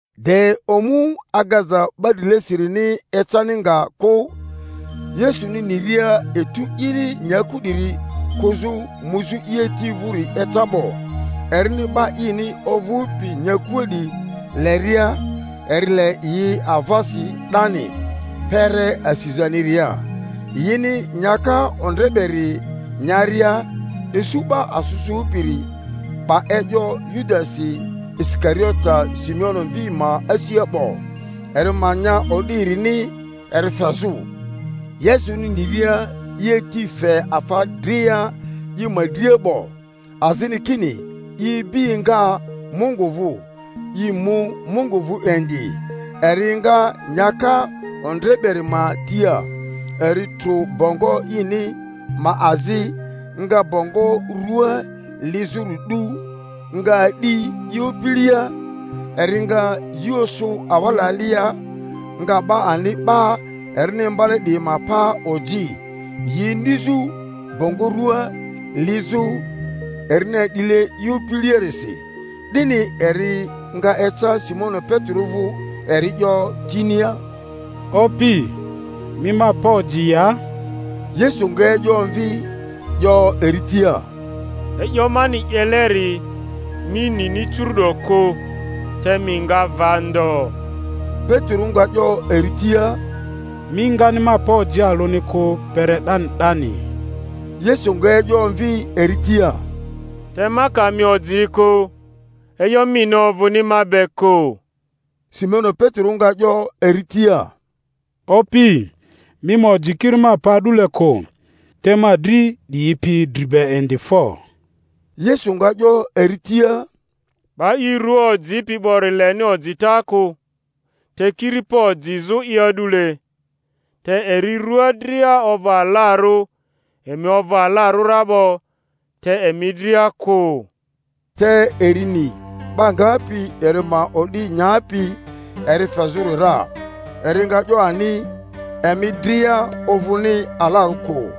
De omu agaza 'ba drilesirini ecani nga kᴜ, Yesuni niria etu ini nyaku 'diri kᴜzᴜ muzᴜ i Ati vᴜri eca 'bo, erini 'ba ini ovᴜpi nyakua 'diyi leria, eri le yi avasi 'dani kpere asizaniria. Yini nyaka ondre beri nyaria, isu 'ba asᴜ sᴜpiri 'ba e'yo Yudasi Isikariote Simoni mvi ma asia 'bo, eri ma nya o'di erini eri fezᴜ, Yesuni niria i Ati fe afa dria i ma dria 'bo, azini kini i ibi enga Mungu vᴜ, i mu Mungu vᴜ indi, eri enga nyaka ondre beri ma tia, eri trᴜ bongo ini ma azi, nga bongo rua lizᴜri 'du, nga a'di i opilia. Eri nga yi osᴜ awala alia, nga 'ba ani 'ba erini imbale 'diyi ma pa oji, yi inizᴜ bongo rua lizᴜ erini a'dile i opiliarisi. 'Dini eri nga eca Simoni Petero vᴜ; eri 'yo tinia, Opi, mi ma pa oji ya? Yesu nga e'yo omvi, 'yo eri tia, E'yo mani 'yeleri mi nini curu'do kᴜ, te mi nga va ndo. Petero nga 'yo eri tia, Mi ngani ma pa oji alᴜni kᴜ kpere 'dani 'dani. Yesu nga e'yo omvi eri tia, Te ma ka mi oji kᴜ, e'yo mini ovᴜni ma be kᴜ. Simoni Petero nga 'yo eri tia, Opi, mi ma oji kiri ma pa a'dule kᴜ, te ma dri 'diyi pi dri be indi fo! Yesu nga 'yo eri tia, 'Ba i rua ojipi 'bori leni ojita kᴜ, te kiri pa ojizᴜ'i a'dule, te eri rua dria ovᴜ alarᴜ; emi ovᴜ alarᴜ ra 'bo, te emi dria kᴜ. Te eri ni 'ba ngapi eri ma o'di nyapi eri fezᴜri ra; eri nga 'yo ani, Emi dria ovᴜni alarᴜ kᴜ.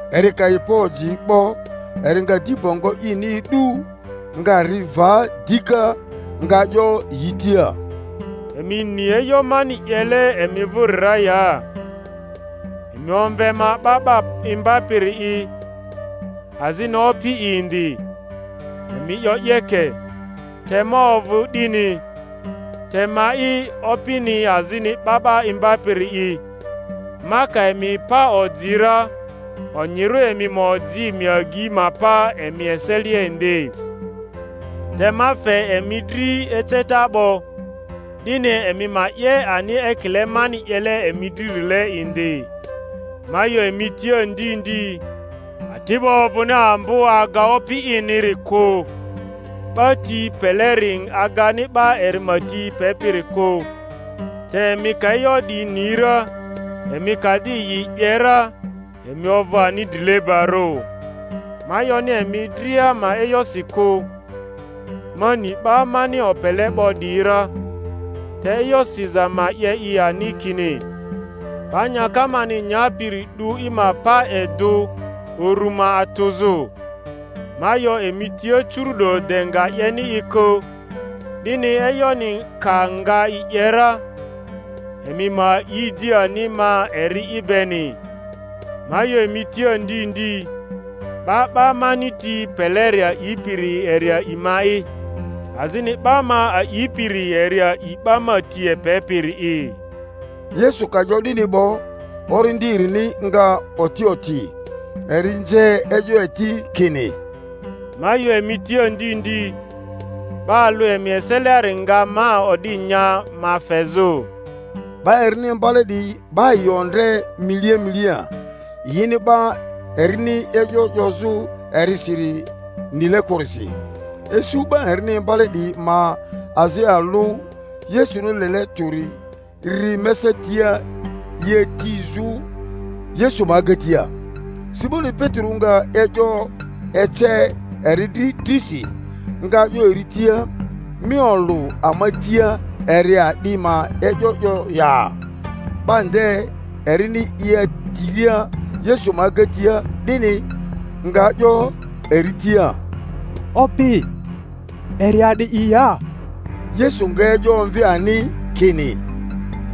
Eri ka yi pa oji 'bo, eri nga di bongo ini e'du, nga ri va dika, nga 'yo yi tia, Emi ni e'yo mani 'yele emi vᴜri ra ya? Emi omve ma 'Ba 'ba Imbapiri'i azini Opi'i indi; emi 'yo 'yeke, te ma ovᴜ 'dini. Te ma'i Opini azini 'Ba 'ba Imbapiri'i, ma ka emi pa oji ra, onyirᴜ emi ma oji emi agyi ma pa emi eselia indi. Te ma fe emi dri eceta 'bo, 'dini emi ma 'ye ani ekile mani 'yele emi dririle indi. Ma 'yo emi tia ndi ndi, ati'bo ovᴜni ambo aga opi iniri kᴜ; 'ba ti peleri agani 'ba eri ma ti pepiri kᴜ. Te emi ka e'yo 'diyi ni ra, emi ka di yi 'ye ra emi ovᴜ ani drilebarᴜ. Ma 'yoni emi dria ma e'yosi kᴜ; ma ni 'ba mani opele 'bo 'diyi ra; te e'yo siza ma 'ye i ani, kini, 'Ba nyaka mani nyapiri 'du i ma paedᴜ uru ma atᴜzᴜ. Ma 'yo emi tia curu'do de nga 'yeni i kᴜ, 'dini e'yoni ka nga i 'ye ra, emi ma a'i di ani ma eri'i beni. Ma 'yo emi tia ndi ndi, 'ba 'ba mani ti peleri a'ipiri eri a'i ma'i; azini 'ba ma a'ipiri eri a'i 'ba ma ti epepiri'i. Yesu ka 'yo 'dini 'bo, orindi erini nga oti oti, eri nze e'yo eti kini, Ma 'yo emi tia ndi ndi, 'ba alᴜ emi eseliari nga ma o'di nya ma fezᴜ. 'Ba erini imbale 'diyi 'ba yi ondre milia milia, yini 'ba erini e'yo 'yozᴜ erisiri nile kᴜrisi. Isu 'ba erini imbale 'diyi ma azi alᴜ Yesuni lele tᴜri ri mesa tia i atizᴜ Yesu ma agatia; Simoni Petero nga e'yo ece eri dri drisi, nga 'yo eri tia, Mi olᴜ ama tia eri a'di ma e'yo 'yo ya? 'Ba nde, erini i atiria Yesu ma agatia 'dini, nga 'yo eri tia, Opi, eri a'di'i ya? Yesu nga e'yo omvi ani kini,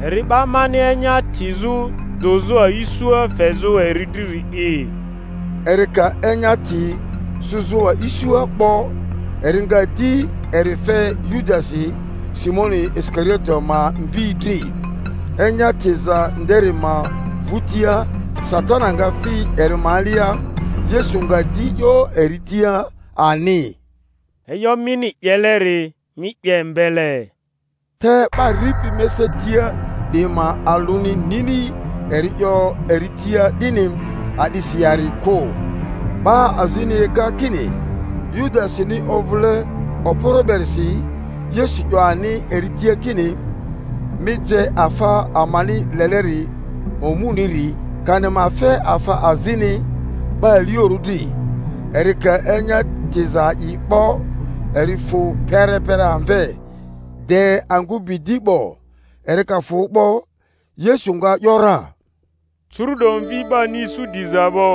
Eri 'ba mani enya tizᴜ dᴜzᴜ a'isua fezᴜ eri driri’i. Eri ka enya ti sᴜzᴜ a'isua 'bo, eri nga di eri fe Yudasi, Simoni Isikariote ma mvi dri. Enya tiza nderi ma vᴜtia, Satani nga fi eri ma alia. Yesu nga di 'yo eri tia ani, E'yo mini 'yeleri, mi 'ye mbele. Te 'ba ripi mesa tia 'diyi ma alᴜni nini eri 'yo eri tia 'dini a'drsi yari kᴜ. 'Ba azini ega kini Yudasini ovᴜle okporo berisi, Yesu 'yo ani eri tia kini, Mi je afa amani leleri omuniri; kani ma fe afa azini 'ba aliorᴜ dri. Eri ka enya tiza a'i 'bo, eri fᴜ perepere amve; de angᴜ bi di 'bo. Eri ka fᴜ 'bo, Yesu nga ‘yora, Curu'do Mvi 'bani isu diza 'bo,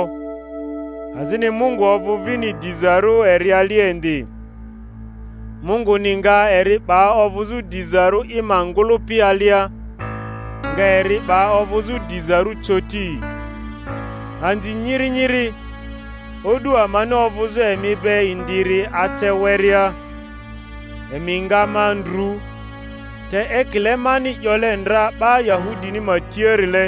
azini Mungu ovᴜ vini dizarᴜ eri alia indi; Munguni nga eri 'ba ovᴜzᴜ dizarᴜ i ma ngᴜlᴜpi alia, nga eri 'ba ovᴜzᴜ dizarᴜ coti. Anzi nyiri nyiri, o'du amani ovᴜzᴜ emi be indiri ace werea. Emi nga ma ndru; te ekile mani 'yole ndra 'ba Yahudini ma tiarile,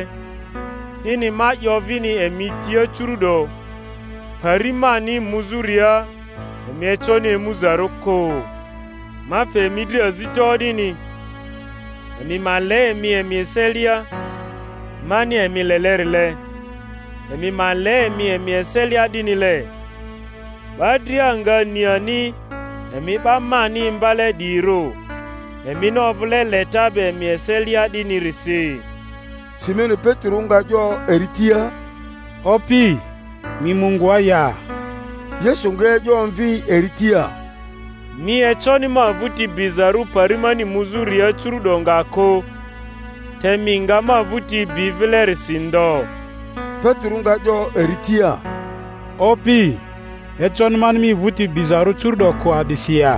'dini ma 'yo vini emi tia curu'do, Pari mani muzᴜria emi econi emuzarᴜ kᴜ. Ma fe emi dri azita o'dini, emi ma le emi emi eselia; mani emi lelerile, emi ma le emi emi eselia 'dinile. 'Ba dria nga ni ani emi 'ba mani imbale 'diyirᴜ, emini ovᴜle leta be emi eselia 'dinirisi. Simoni Petero nga 'yo eri tia, Opi, mi mu ngoa ya? Yesu nga e'yo omvi eri tia, Mi econi ma vᴜti bizarᴜ pari mani muzᴜria curu'do nga kᴜ; te mi nga ma vᴜti bi vilerisi ndo. Petero nga 'yo eri tia, Opi, econi mani mi vᴜti bizarᴜ curu'do kᴜ a'disi ya?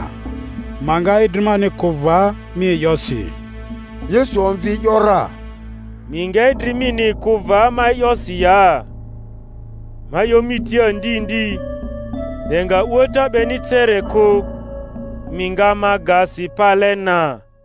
Ma nga idri mani kᴜ va mi e'yosi. Yesu omvi e’yo ra, Mi nga idri mini kᴜ va ma e'yosi ya? Ma 'yo mi tia ndi ndi, de nga a'uata 'beni cere kᴜ, mi nga ma ga si pale na.